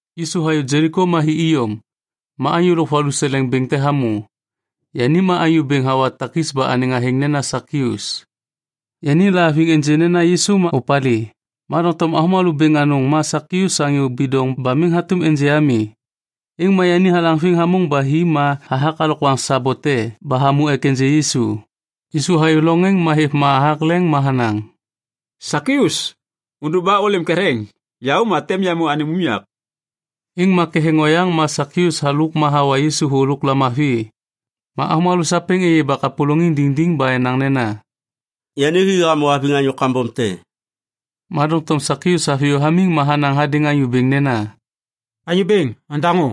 Yisu hayô Jeliko ma hi iyom. Ma anyô lôk valuseleŋ bêŋ te hamô. Yani ma anyô bêŋ hawa takis ba anêŋ athêŋ nena Sakius. Yani lahaviŋ ênjê nena Yisu ma opalê, ma doŋtom avômalô bêŋ anôŋ ma Sakius anyô bidoŋ ba miŋ hatôm ênjê ami. Êŋ ma yani halaŋviŋ hamôŋ ba hi ma hathak alokwaŋ sabo te ba hamô ek ênjê Yisu. Yisu hayô loŋ êŋ ma hêv ma hathak leŋ ma hanaŋ, “Sakius, ôndôk ba ôlêm ketheŋ. Yaô ma tem yamô anêm unyak.” Êŋ ma ketheŋ oyaŋ ma Sakius halôk ma hawa Yisu thô lôk lamavi. Ma avômalô sapêŋ êyê ba kapôlôŋiŋ diŋdiŋ ba enaŋ nena, “Yani hi hamô haviŋ anyô kambom te.” Ma doŋtom Sakius haviyô hamiŋ ma hanaŋ hadêŋ Anyô Bêŋ nena, “Anyô Bêŋ, ondaŋô.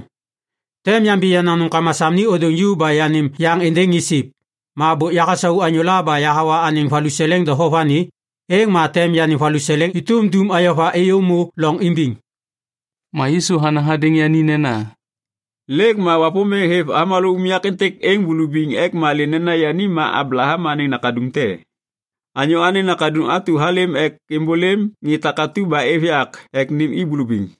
Tem yambi yenaŋ nômkama sam ni ôdôŋ ju ba yanêm yaŋ êndêŋ ŋê siv. Ma bôk yahasau anyôla ba yahawa anêŋ valuseleŋ doho vani, êŋ ma tem yanêm valuseleŋ êtôm dum ayova êyômô loŋ imbiŋ.” Ma Yisu hanaŋ hadêŋ yani nena, “Lêk ma Wapômbêŋ hêv avômalô unyak êntêk êŋ bulubiŋ ek malê nena yani ma Ablaham anêŋ nakaduŋ te. Anyô Anêŋ Nakaduŋ atu halêm ek êmbôlêm ŋê takatu ba êv yak ek nêm i bulubiŋ.”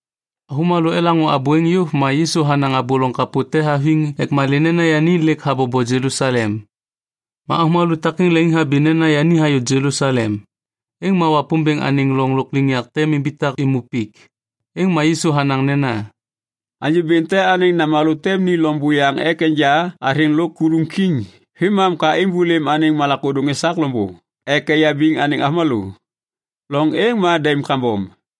Avômalô elaŋô abô êŋ yôv ma Yisu hanaŋ abô loŋ kapô te haviŋ ek malê nena yani lêk habobo Jelusalem. Ma avômalô takêŋ leŋiŋhabi nena yani hayô Jelusalem, êŋ ma Wapômbêŋ anêŋ loŋ lôkliŋyak tem imbitak êmô pik. Êŋ ma Yisu hanaŋ nena, “Anyô bêŋ te anêŋ namalô tem ni loŋ buyaŋ ek enja athêŋ lôk kuluŋ kiŋ vêmam ka êmbôlêm anêŋ malak ôdôŋ esak loŋbô ek eyabiŋ anêŋ avômalô. Loŋ êŋ ma daim kambom.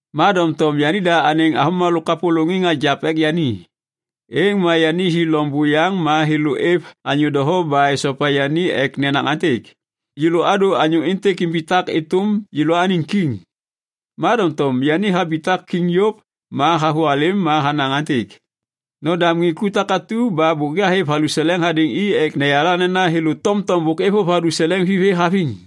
“Ma doŋtom yanida anêŋ avômalô kapôlôŋiŋ agiap ek yani. Êŋ ma yani hi loŋ buyaŋ ma thêlô êv anyô doho ba esopa yani ek nenaŋ aêntêk, ‘Yêlô adô anyô êntêk imbitak êtôm yêlôaniŋ kiŋ.’ “Ma doŋtom yani habitak kiŋ yôv ma havôhalêm ma hanaŋ aêntêk, ‘Nodam ŋê ku takatu ba bôk yahêv valuseleŋ hadêŋ i ek yayala nena thêlô tomtom bôk êvôv valuseleŋ vithê haviŋ.’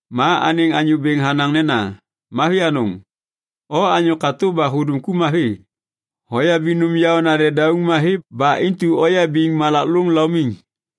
“Ma anêŋ anyô bêŋ hanaŋ nena, ‘Mavi anôŋ! O anyô katô ba hudum ku mavi. Hoyabiŋ nôm yaôna dedauŋ mavi ba intu oyabiŋ malak lôŋ laumiŋ.’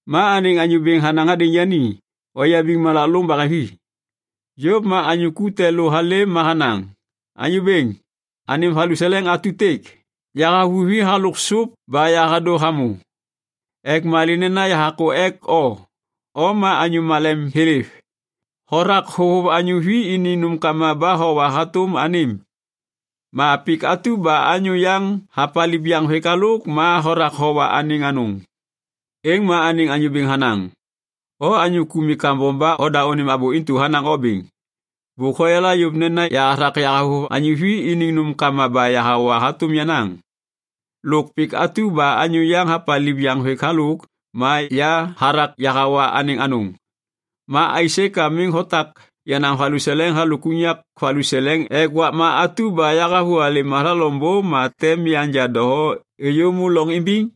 “Ma anêŋ anyô bêŋ hanaŋ hadêŋ yani, ‘Oyabiŋ malak lôŋ baheŋvi.’ “Yôv ma anyô ku te lô halêm ma hanaŋ, ‘Anyô bêŋ, anêm valuseleŋ atutêk. Yahavuvi halôk sôp ba yahadô hamô ek malê nena yahakô ek o. O ma anyô malem thêlêv. Hothak hôvôv anyô vi iniŋ nômkama ba howa hatôm anêm. Ma pik atu ba anyô yaŋ hapaliv yaŋvêk halôk ma hothak howa anêŋ anôŋ.’ “Êŋ ma anêŋ anyô bêŋ hanaŋ, ‘O anyô ku mi kambom ba oda anêm abô intu hanaŋ o bêŋ. Bôk hoyala yôv nena ya hathak yahavôv anyô vi iniŋ nômkama ba yahawa hatôm yenaŋ. Lôk pik atu ba anyô yaŋ hapaliv yaŋvêk halôk ma ya hathak yahawa anêŋ anôŋ. Ma aisê ka miŋ hotak yenaŋ valuseleŋ halôk unyak valuseleŋ ek êmbôv doho ami ek wakma atu ba yahavôhalêm hathak loŋbô ma tem yanja doho êyômô loŋ imbiŋ?’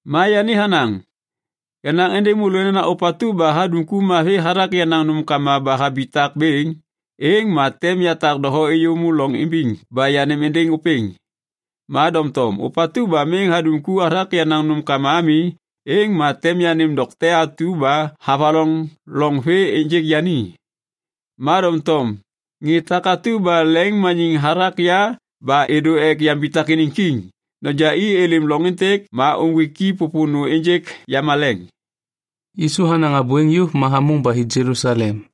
“Ma yani hanaŋ, ‘Yanaŋ êndêŋ môlô nena ôpatu ba hadum ku mavi hathak yenaŋ nômkama ba habitak bêŋ, êŋ ma tem yatak doho êyômô loŋ imbiŋ ba yanêm êndêŋ ôpêŋ. Ma doŋtom ôpatu ba miŋ hadum ku hathak yenaŋ nômkama ami, êŋ ma tem yanêm dokte atu ba havaloŋ loŋ vê ênjêk yani.’ “Ma doŋtom ŋê takatu leŋiŋmaniŋ hathak ya ba êdô ek yambitak iniŋ kiŋ, ‘Noja i êlêm loŋ êntêk ma uŋgwik i pôpônô ênjêk yamaleŋ.’” Yisu hanaŋ abô êŋ yôv ma hamôŋ ba hi Jelusalem.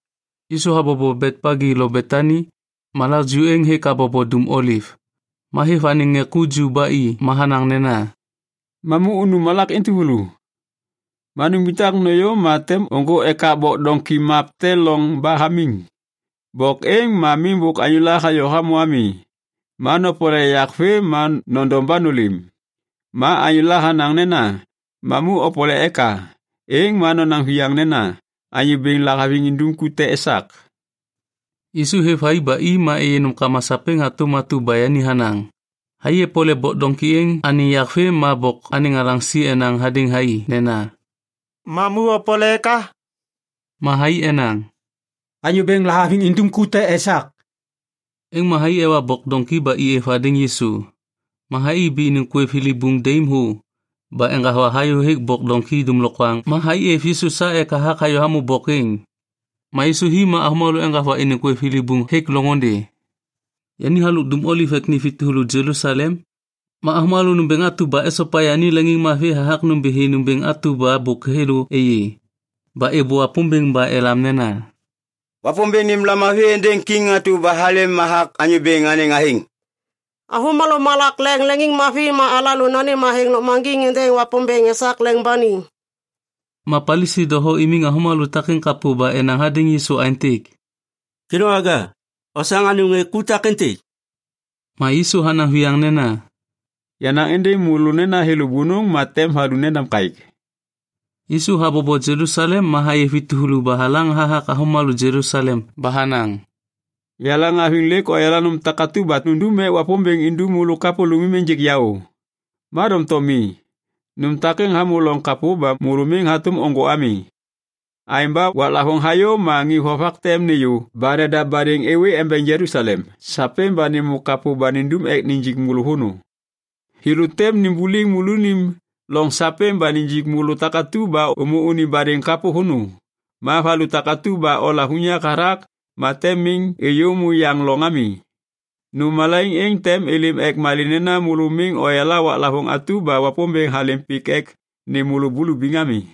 Yisu habobo Betpagi lo Betani, malak ju êŋ hêk habobo Dum Oliv. Ma hêv anêŋ ŋê ku ju ba i ma hanaŋ nena, “Mamu unu malak entuvulu. Ma numbitak nôyô ma tem ôŋgô ekak bok doŋki map te loŋ ba hamiŋ. Bok êŋ ma miŋ bôk anyôla hayô hamô ami. Ma nopole yak vê ma nondom ba nôlêm. Ma anyôla hanaŋ nena, ‘Mamu opole eka’, êŋ ma nonaŋ viyaŋ nena, ‘Anyô Bêŋ lahaviŋ indum ku te esak.’” Yisu hêv thai ba i ma êyê nômkama sapêŋ hatôm atu ba yani hanaŋ. Thai epole bok doŋki êŋ anêŋ yak vê ma bok anêŋ alaŋsi enaŋ hadêŋ thai nena, “Mamu opole eka?” Ma thai enaŋ, “Anyô Bêŋ lahaviŋ indum ku te esak.” Êŋ ma thai ewa bok doŋki ba i êv hadêŋ Yisu. Ma thai ibi iniŋ kwêv thilibuŋ daim thô ba eŋgava hayôhêk bok doŋki dômlokwaŋ, ma thai êv Yisu sa ek hathak hayô hamô bok êŋ. Ma Yisu hi ma avômalô eŋgava iniŋ kwêv thilibuŋ hêk loŋôndê. Yani halôk Dum Oliv ek ni vi tuvulu Jelusalem. Ma avômalô nômbêŋ atu ba esopa yani leŋiŋmavi hathak nômbithi nômbêŋ atu ba bôk thêlô êyê. Ba êbô Wapômbêŋ ba elam nena, “Wapômbêŋ nêm lamavi êndêŋ kiŋ atu ba halêm hathak Anyô Bêŋ anêŋ athêŋ! Avômalô malak leŋ leŋiŋmavi ma alalô nanêm athêŋ lôkmaŋgiŋ êndêŋ Wapômbêŋ esak leŋ ba ni.” Ma Palisi doho imiŋ avômalô takêŋ kapô ba enaŋ hadêŋ Yisu aêntêk, “Kêdôŋwaga, osaŋ anêm ŋê ku takêntêk.” Ma Yisu hanaŋ viyaŋ nena, “Yanaŋ êndêŋ môlô nena thêlô bônôŋ ma tem valu nendam kaêk.” Yisu habobo Jelusalem ma hayê vi tuvulu ba halaŋ hathak avômalô Jelusalem ba hanaŋ, “Yaleŋhaviŋ lêk oyala nôm takatu ba nundum ek Wapômbêŋ indum môlô kapôlômim ênjêk yaô. Ma doŋtom mi, nôm takêŋ hamô loŋ kapô ba môlô miŋ hatôm ôŋgô ami. Aêŋ ba waklavôŋ hayô ma ŋê vovak tem nêyô ba nedav badêŋ êwê embeŋ Jelusalem sapêŋ ba nêmô kapô ba nindum ek nijik môlô vônô. Thêlô tem nimbuliŋ môlônim loŋ sapêŋ ba nijik môlô takatu ba ômô unim badêŋ kapô vônô. Ma valu atu ba olav unyak hathak ma tem miŋ êyômô yaŋ loŋ ami. Nôm malaiŋ êŋ tem êlêm ek malê nena môlô miŋ oyala waklavôŋ atu ba Wapômbêŋ halêm pik ek nêm môlô bulubiŋ ami.”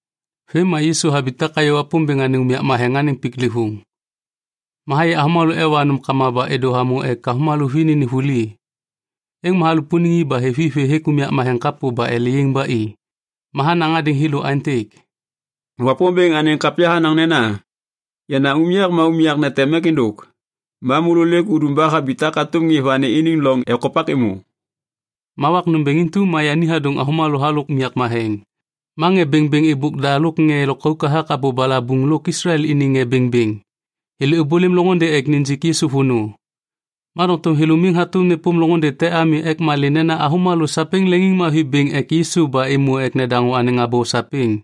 Vêm ma Yisu habitak hayô Wapômbêŋ anêŋ unyak matheŋ anêŋ piklêvôŋ. Ma hayê avômalô ewa nômkama ba êdô hamô ek avômalô vi nênêm vuli. Êŋ ma halupuniŋ i ba hêv i vê hêk unyak matheŋ kapô ba ele yaiŋ ba i. Ma hanaŋ hadêŋ thêlô aêntêk, “Wapômbêŋ anêŋ kapya hanaŋ nena, ‘Yenaŋ unyak ma unyak neteŋ mek êndôk.’ Ma môlô lêk udum ba habitak hatôm ŋê vani iniŋ loŋ ekopak êmô.” Ma wak nômbêŋ intu ma yani hadôŋ avômalô halôk unyak matheŋ. Ma ŋê bêŋbêŋ êbôk da lôk ŋê lôkauk hathak abô balabuŋ lôk Islael iniŋ ŋê bêŋbêŋ, thêlô êbôlêm loŋôndê ek nijik Yisu vônô. Ma doŋtom thêlô miŋ hatôm nêpôm loŋôndê te ami ek malê nena avômalô sapêŋ leŋiŋmavi bêŋ ek Yisu ba êmô ek nedaŋô anêŋ abô sapêŋ.